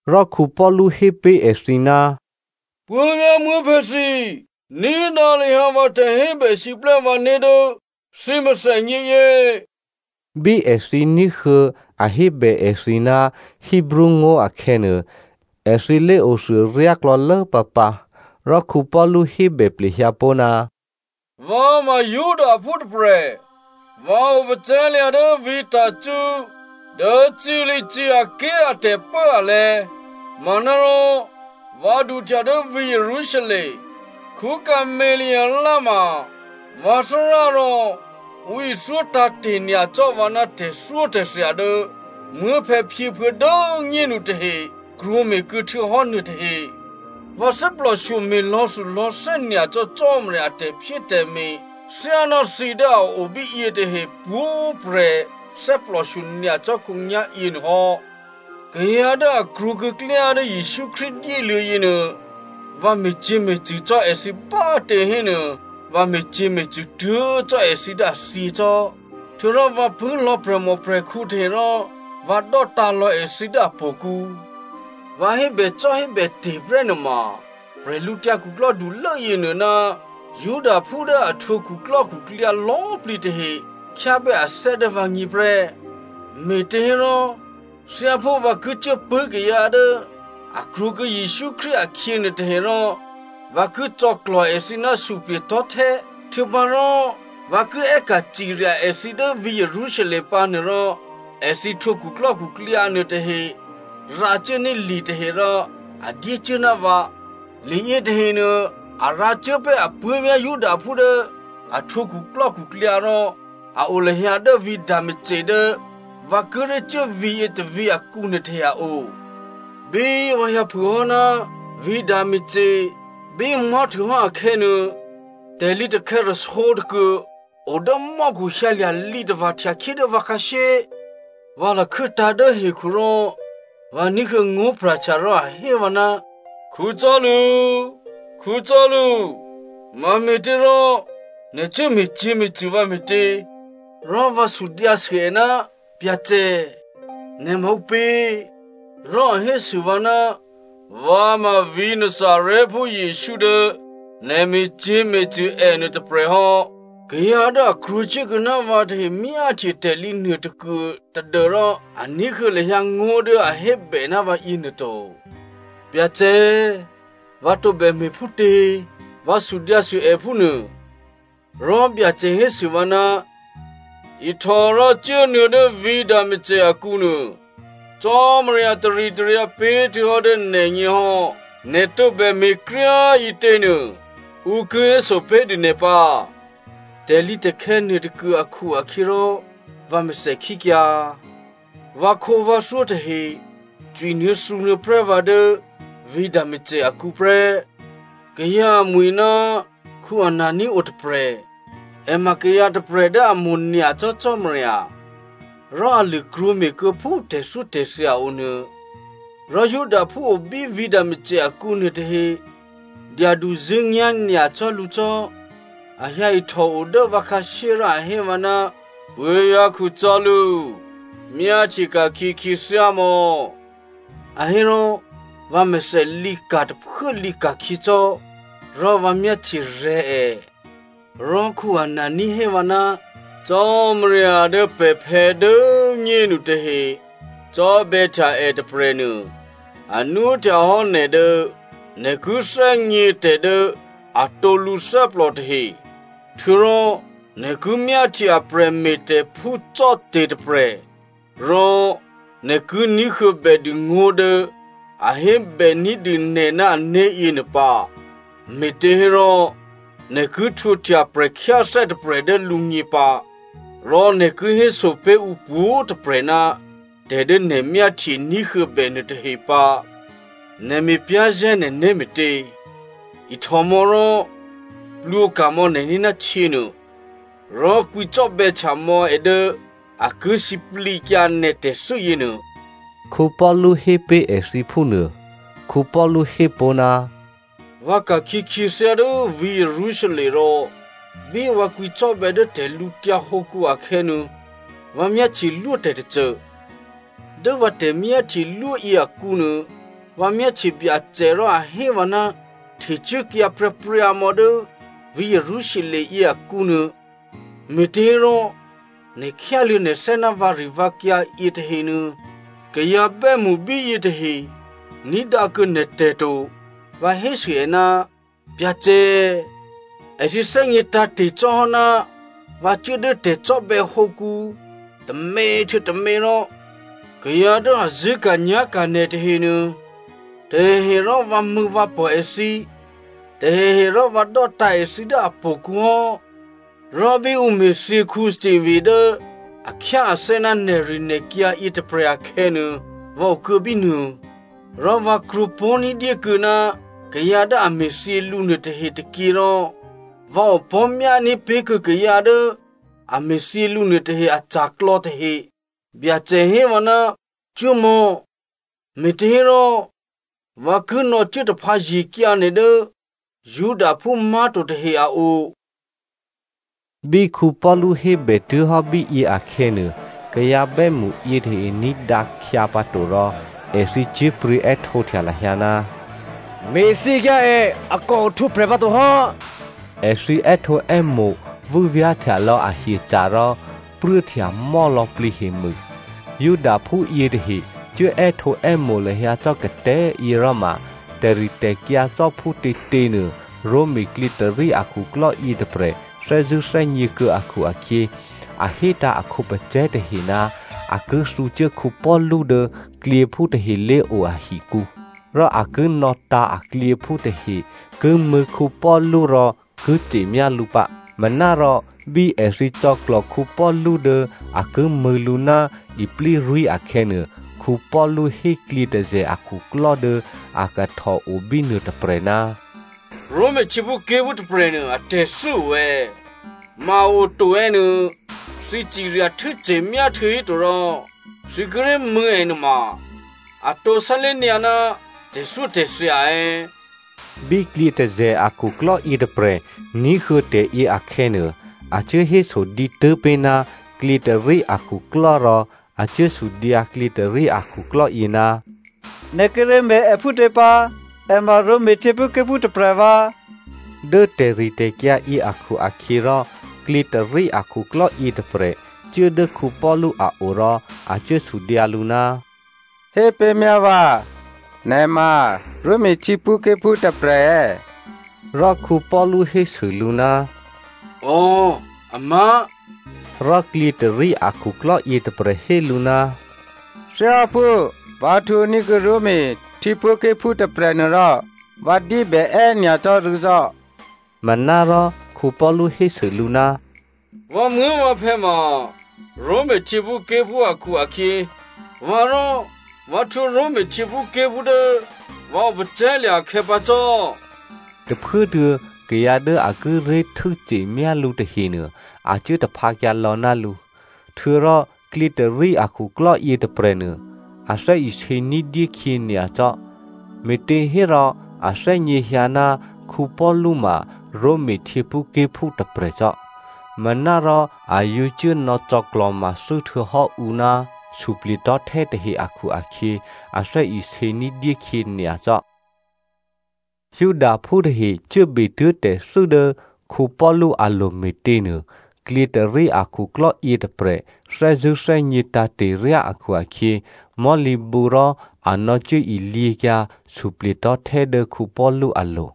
Rò Paulu hé pé̤ èthǐ, “Puố̤vyá̤ muố̤phè̌ thǐ꤮, ní̤dǎ lahyǎ vǎ tè̤hébèsiplè́ vǎné̤ dố thǐ mèthènyě yě.” Bí èthǐ ní̤huô̌ a hébè èthǐ ná Hebreo ngó̤ akhè̌nuô, èthǐ lé̤othuô ryáklò̌lố pǎpǎ. Rò Paulu hébè plehyǎ pó̤, “Vǎ ma Judaphú tôprè̤, vǎ opacè̤̌lya̤ dố vǐ̤ Tarso, dố Cilicia ké̤ a tè̤pốalè̤̌, manárò vǎ duhtya dố vǐ̤ Jerusalem. Gamalie ma vǎ Thárá rò ǔ ithyó tǎ̤te̤ nyacò́ vǎ ná tè̤thyótè̤thya dố muố̤phè̌phyěphuô̌ dố꤮ nyénu tahe krwǒme̤kuô̌ htuô̌hò́ nuôtahe. Vǎ thè́plòshyo me̤lò̌thulò̌thè́ nyacò́ Cò́marya a tè̤phyétè̤me̤ thyáná thǐ dố a o bíyě tahe pwǒ̤prè̤ thè́plòshyo nyacò́ khǒnyá̤ yěnuôhò́. Kayǎ dố a krwǒkuô̌ klyá dố Jesǔ Krístu dyéluô̌ yěnuô, vǎ me̤cyě̤me̤cṳ̂ cò́ èthǐ bá꤮ tě hénuô, vǎ me̤cyě̤me̤cṳ̂ tuố̤ cò́ èthǐ dố a thyě cò́. Htuô̌rò vǎ pṳ̂́ lò̌ prè̤mòprè̤khǔ tahe rò vǎ dò́tǎ̤lò̌ èthǐ dố htò̌kǔ. Vǎ hébècò́hébète̤ prè́ nuôma, bwídukhulố yěnuô ná Judaphú dố a htwǒ khuklò́khuklyǎ lò̌꤮ plǐ tahe khyábè́ athè́ dố vǎgně prè́. Me̤těhérò, thyáphú vǎ ki cuốpṳ̂́ kayǎ dố a krwǒkuô̌ Jesǔ Krístu akhyě nuôtahe rò vǎ ki cò̌klò̤ èthǐ ná suplye̤tò̤́htè́, htuô̌pǎrò vǎ ki è́ka̤ cirya èthǐ dố vǐ̤ Jerusalem pǎ nuôrò, èthǐ htwǒ khuklò́khuklyǎ nuôtahe rǎcuốní̤ litahe rò a dyécuố ná vǎ. Li yětahenuô, a rǎcuố pé̤ apuố̤vyá̤ Judaphú dố a htwǒ khuklò́khuklyǎ rò a o lahyǎ dố vǐ̤ Damasco dố vǎ kíré̤ cuố vǐ̤yě tôvǐ̤ akǔ nuôtahe a o.” “Bí vǎ hyǎ phûhò́ ná vǐ̤ Damasco bí mò̤́htuôhò́ akhè̌nuô, tè̤lǐtakhè̌ rasǒ tôkuô o dố mò́khu hyǎlya̤ lǐtava̤ htyakhyé dố vǎ khǎshyé. Vǎ lakhû́tǎ̤ dố hekhu rò vǎ ní̤huô̌ ngó̤ pra̤htya rò a hé vǎ, ‘Saulu꤮, Saulu꤮, mame̤těrò nè̤ cuố me̤cyě̤me̤cṳ̂ vǎ me̤tě?’ “Rò vǎ sudyǎsû è, ‘Byacè, nè̤ ma ǔpě?’ “Rò a hésû vǎ, ‘Vǎ ma vǐ̤ Nazarèphú Jesǔ dố nè̤ me̤cyě̤me̤cṳ̂ ènuô tôprè̤ hò́.’ Kayǎ dố a krwǒcuốkuô̌ ná vǎ tahe myáhtye tè̤lǐ nuôtôkuô tadû́rò a ní̤huô̌ lahyǎ ngó̤ dố a hébè ná vǎ yěnuô to. “‘Byacè꤮, vǎ tǒbè me̤phútě?’ Vǎ sudyǎsû è phúnuô. “Rò Byacè hésû vǎ, ‘Ihtò rò cuốnuô̌ dố vǐ̤ Damasco akǔ nuô. Cò́marya taritaryǎ pé̤htuô̌hò́ dố nè̤gně hò́, nè̤ tǒbè me̤kryá꤮ ǐtěnuô, ǔ ki héso pé̤dû nè̤ pǎ.’ Tè̤lǐtakhè̌ nuôtôkuô akhu-akhyěrò vǎ mèthèkhíkyǎ. Vǎkhǒvǎthyó tahe cwinuô̌thǔnuô̌ prè́ vǎ dố vǐ̤ Damasco akǔ prè́. “Kayǎ amwi̤ ná Anania o tôprè̤, è ma kayǎ tôprè̤ dố a mo̤nyacò́ Cò́marya, rò a lṳ̂ krwǒme̤kuô̌ phú tè̤thyótè̤thya o nuô. Rò Judaphú o bí vǐ̤ Damasco akǔ nuôtahe dyaduzṳ̂́nyá̤ nyacò́ lǔ cò́. A hyǎ ihtòo dố vǎ khǎshyé rò a hé vǎ, ‘Puố̤vyá̤ Saulu꤮, myáhtye ka̤khyě khyěthyámò̌,’ a hé rò, vǎmèthè lǐka̤ tôphuố lǐka̤khyěcò́, rò vǎ myáhtyerè̤̌ è. “Rò Anania hé vǎ, ‘Cò́marya dố pè̤phè̌ dố꤮ nyénu tahe cò́bè̌htya è tôprè̤nuô, a nwóhtyahò́ nè̤ dố nè̤ ki thè́gně tè̤ dố atǒ lǔthè́plò tahe, htuô̌rò nè̤ ki myáhtye a prè̤me̤tè̤phú cò́te̤ tôprè̤, rò nè̤ ki ní̤huô̌bè dû ngó̤ dố a hébè ní̤dû nè̤ ná ané̤ yěnuô pǎ. Me̤těhérò nè̤ ki htwǒhtya prè̤khyáthè́ tôprè̤ dố lǔgně pǎ, rò nè̤ ki héso pé̤ ǔ pwǒ̤꤮ tôprè̤ ná tè̤ dố nè̤ myáhtye, ní̤huô̌bè nuôtahe pǎ. Nè̤ me̤ pyá̤zè̤́ nè̤né̤ me̤tě? Ihtòmò̌ rò plwǒka̤mò̌ nè̤né̤ ná htyěnuô, rò kwǐcò́bè̌htya mò̌ è dố a ki sǐplǐkyǎ nè̤ tè̤thû́ yěnuô,’” Paulu hé pé̤ èthǐ phúnuô. Paulu hé pó̤, “Vǎ ka̤khyě khyěthyá dố vǐ̤ Jerusalem rò bí vǎ kwǐcò́bè̌ dố tè̤lǔtyǎ hǒkǔ akhè̌nuô, vǎ myáhtyelwó tè̤tôcô. Dố vǎ tè̤myáhtyelwó yěakǔnuô, vǎ myáhtye Byacè rò a hé vǎ, ‘Htecuốkyǎ pryǎpryǎmò̌ dố vǐ̤ Jerusalem yěakǔnuô, me̤těhérò nè̤ khyáluô̌ nè̤thè́ ná vǎrivǎkyǎ yětahenuô kayǎ bè́mṳ bíyě tahe ní̤dǎkuô̌ nè̤tè̤ to.’ “Vǎ hésû è, ‘Byacè꤮, èthǐ thè́gně tǎ̤te̤ cò́hò́ ná vǎ cuố dố tè̤cò́bè̌hǒkǔ tômě htuô̌ tômě rò kayǎ dố a zṳ̂́ka̤nyá̤ka̤ nè̤ tahenuô, tahehe rò vǎmṳ̂̌vǎpò̤ èthǐ, tahehe rò vǎ dò́tǎ̤ èthǐ dố htò̌kǔ hò́. Rò bí ǔ me̤thyě Stephano dố a khyáathè́ ná nè̤rinè̤kyǎ yětôprè̤ akhè̌nuô, vǎ okuô̌ bínuô, rò vǎ krwǒpó̤ ní̤dyé kuô̌ ná kayǎ dố a me̤thyě lǔ nuôtahe tôkyě rò vǎ opò̤́myání̤ pé̤kuô̌ kayǎ dố a me̤thyě lǔ nuôtahe aca̤klò̌ tahe.’ “Byacè hé vǎ, ‘Cuốmò̌! Me̤těhérò, vǎ ki nò̌cuố taphǎye̤kyǎ nè̤ dố Judaphú má̤to tahe a o.’” Bí Paulu hébè tuố̤hò́ bíyě akhè̌nuô, kayǎ bè́mṳ yětahe ní̤dǎ khyǎpǎto rò èthǐ cyé̤pryě̤ è́htǒhtya lahyǎ, “Me̤thyěkyǎ è! A kò ohtwǒprè̤ pǎ to hò́!” Èthǐ è́htǒè́mo̤, vû́vyá̤htya lò̌ ahyeca̤ rò pruốhtyamò́ lò̌plǐ hemû. Judaphú yětahe cuố è́htǒè́mo̤ lahyǎ cò́ katè̤́yě rò ma, tè̤ritè̤kyǎ cò́phútětěnuô, Roma klyětôrí akhuklò́ yětôprè̤ thè́zṳ̂́ thè́gně kuô̌ akhu-akhyě, a hétǎ̤ a khǒpacè̤̌ tahe ná a ki thǔcuố Paulu dố klyěphú tahe lé̤o ahikǔ, rò a ki nò̌tǎ̤ aklyěphú tahe ki mṳ̂̌ Paulu rò ki ce̤myá lǔ pǎ. Manárò bí èthǐ cò̌klò̤ Paulu dố a ki mṳ̂̌ lǔ ná iplírwí̤ akhè̌nuô, Paulu hé klyětôzè̤ akhuklò́ dố a kahtò obínuô tôprè̤, “Roma htyěphúké̤phú tôprè̤nuô atè̤thû́ o è̌, ma a oto è̌ nuô, thǐ cirya htû́ce̤myá htuô̌híto rò thǐ kíré̤ mṳ̂̌ è nuôma atǒ sálé̤ nyǎ ná tè̤thyótè̤thya è̌?” Bí klyětôzè̤ akhuklò́ yětôprè̤ ní̤huô̌ tè̤yě akhè̌nuô, a cuố héso dǐtû́ pé̤ ná klyětôrí akhuklò́ rò a cuốsudyǎ klyětôrí akhuklò́ yě, “Nè̤ kíré̤ me̤ è phútě pǎ? È ma Roma htyěphúké̤phú tôprè̤ vǎ!” Dố tè̤ritè̤kyǎ yě akhu-akhyěrò, klyětôrí akhuklò́ yětôprè̤ cuố dố Paulu a o rò a cuố sudyǎ lǔ, “Hépé̤myá vǎ, nè̤ ma Roma htyěphúké̤phú tôprè̤ è̌?” Rò Paulu hésû lǔ, “Ò꤮ amá̤.” Rò klyětôrí akhuklò́ yětôprè̤ hé lǔ, “Thyáphú vǎ htwǒní̤kuô̌ Roma htyěphúké̤phú tôprè̤ nuôrò, vǎ dyébè è́ nyacò́ rû̌ cò́.” Manárò Paulu hésû lǔ, “Vǎmuố̤vǎphè̌ ma Roma htyěphúké̤phú akhu-akhyě, vǎ rò, vǎ htwǒ Roma htyěphúké̤phú dố vǎ opacè̤̌lya̤ akhè̌pǎ cò́.” Tôphuốtuô̌, kayǎ dố a kíré̤ htû́ce̤myá lǔ tahenuô, a cuố taphǎkyǎ lò̌ ná lǔ. Htuô̌rò klyětôrí akhuklò́ yětôprè̤nuô, a thè́isě ní̤dyé khyě nyacò́, me̤těhérò a thè́gně hyǎ ná Paulu ma Roma htyěphúké̤phú tôprè̤cò́, manárò a yǒ cuốnò̌ cò̌klò̤mathû́ htuô̌hò́ ǔ ná suplye̤tò̤́htè́ tahe akhu-akhyě, a thè́isě ní̤dyé khyě nyacò́. Judaphú tahe cuốbetuố̤ tè̤thû́ dố Paulu alo̤ me̤těnuô, klyětôrí akhuklò́ yětôprè̤ thè́zṳ̂́ thè́gně tǎ̤te̤ryá akhu-akhyě, mò̤́lǐbǔrò, a nò̌cuố ilyěkyǎ suplye̤tò̤́htè́ dố Paulu alo̤.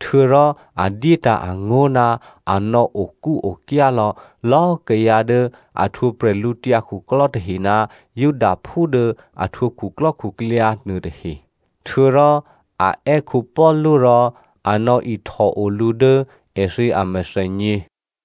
Htuô̌rò a dyétǎ̤ angó̤ ná a nò̌okúokyá lò̌lò̌꤮ kayǎ dố a htwǒ prè̤lǔtyǎ khuklò́ tahe ná Judaphú dố a htwǒ khuklò́khuklyǎ nuôtahe. Htuô̌rò a è́ Paulu rò a nò̌ihtòo lǔ dố èthǐ amèthènyě.